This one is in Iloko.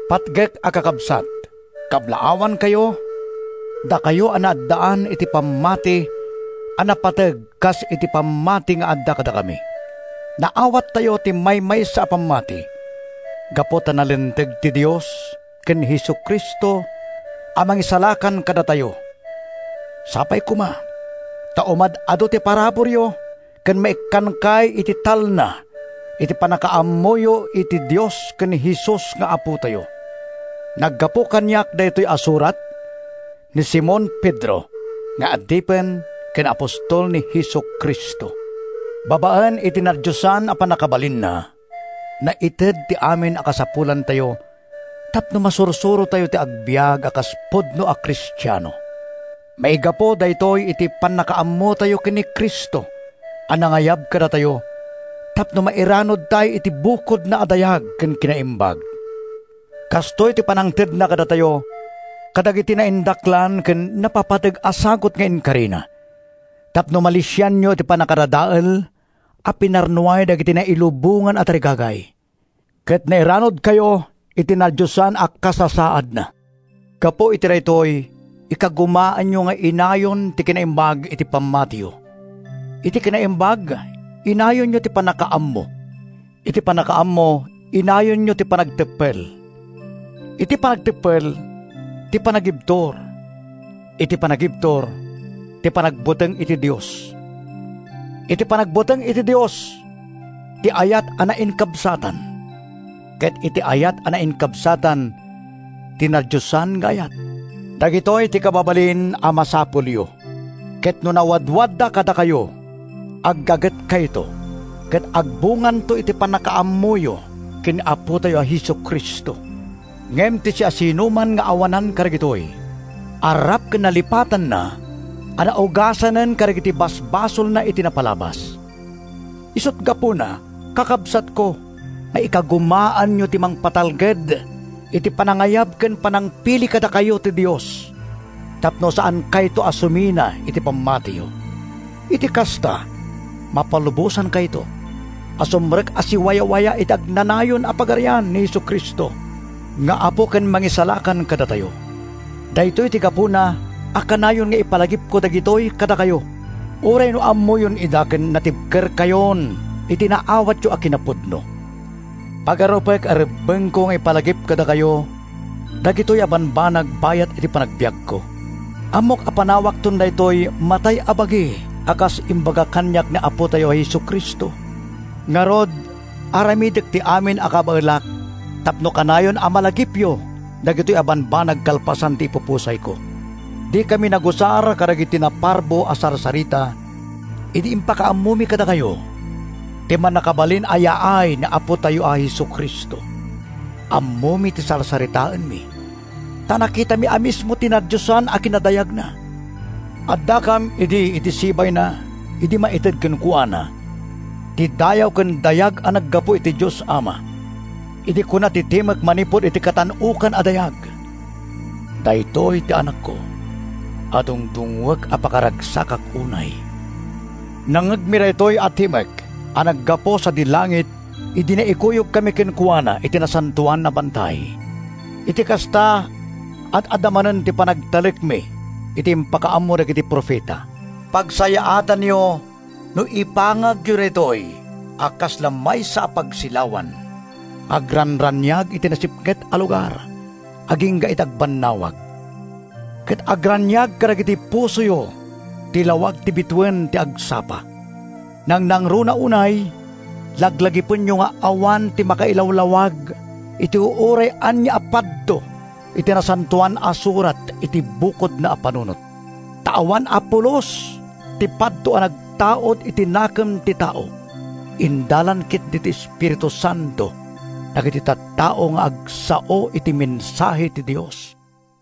Patgek a Kakabsat: Kablaawankayo, dakayo a naaddaan iti pammati a napateg kas iti pammati nga adda kadakami. Naawattayo ti maymaysa a pammati gapu ta nalinteg ti Dios ken ni Jesu-Cristo a Mangisalakan kadatayo. Sapay koma ta umad-adu ti paraburyo ken maikkankay iti talna iti pannakaammoyo iti Dios ken ni Jesus nga Apotayo. Naggapu kaniak daytoy a surat—ni Simon Pedro nga adipen ken apostol ni Jesu-Cristo. Babaen iti nadiosan a pannakabalinna, naited ti amin a kasapulantayo tapno masursurotayo ti agbiag a kas pudno a Kristiano. Maigapu daytoy iti pannakaammotayo ken ni Cristo a nangayab kadatayo tapno mairanudtay iti bukodna a dayag ken kinaimbag. Kastoy ti pannangtedna kadatayo kadagiti naindaklan ken napapateg a sagut nga inkarina tapno malisianyo ti pannakadadael a pinarnuay dagiti nailubongan a tarigagay ket nairanudkayo iti nadiosan a kasasaadna. Gapu iti daytoy, ikagumaanyo nga inayon ti kinaimbag iti pammatiyo; iti kinaimbag, inayonyo ti pannakaammo; iti pannakaammo, inayonyo ti panagteppel; iti panagteppel, ti panagibtur; iti panagibtur, ti panagbuteng iti Dios; iti panagbuteng iti Dios, ti ayat a nainkabsatan; ket iti ayat a nainkabsatan, ti nadiosan nga ayat. Dagitoy ti kababalin a masapulyo, ket no nawadwadda kadakayo, aggagetkayto ket agbunganto ti pannakaammoyo ken ni Apotayo a Jesu-Cristo. Ngem ti siasinoman nga awanan kadagitoy, arrap ken nalipatanna a naugasanen kadagiti basbasolna iti napalabas. Isut’ gapuna, kakabsatko, nga ikagumaanyo ti mangpatalged iti panangayab ken panangpili kadakayo ti Dios tapno saankayto a sumina iti pammatiyo. Iti kasta, mapalubosankayto a sumrek a siwawayawaya iti agnanayon a Pagarian ni Jesu-Cristo nga Apo ken Mangisalakan kadatayo. Daytoy ti gapuna a kanayon nga ipalagipko dagitoy kadakayo uray no ammoyon ida ken natibkerkayon iti naawatyo a kinapudno. Pagarupek a rebbengko nga ipalagip kadakayo dagitoy a bambanag bayat ti panagbiagko. Ammok a panawakton daytoy matay a bagi a kas imbaga kaniak ni Apotayo a Jesu-Cristo. Ngarud, aramidek ti amin a kabaelak tapno kanayon a malagipyo dagitoy a bambanag kalpasan ti ipupusayko. Dikami nagusar kadagiti naparbo a sarsarita idi impakaammomi kadakayo ti mannakabalin a yaay ni Apotayo a Jesu-Cristo. Ammomi ti sarsaritaenmi ta nakitami a mismo ti nadiosan a kinadayagna. Addakam idi iti sibayna idi maited kenkuana ti dayaw ken dayag a naggapu iti Dios Ama, idi kuna ti timek manipud iti Katan-okan a Dayag, “Daytoy ti Anakko a dungdungngoek a pakaragsakak unay!” Nangngegmi daytoy a timek a naggapu sadi langit idi naikuyogkami kenkuana iti nasantoan a bantay. Iti kasta, ad-adda manen ti panagtalekmi iti impakaammo dagiti profeta. Pagsayaatanyo no ipangagyo daytoy a kasla maysa a pagsilawan nga agranraniag iti nasipnget a lugar agingga iti agbannawag, ket agraniag kadagiti pusoyo ti lawag ti bituen ti agsapa. Nangnangruna unay, laglagipenyo nga awan ti makailawlawag iti uray ania a padto iti Nasantoan a Surat iti bukodna a panunot. Ta awan a pulos ti padto a nagtaud iti nakem ti tao. Indalan ketdi ti Espiritu Santo dagiti tattao nga agsao iti mensahe ti Dios.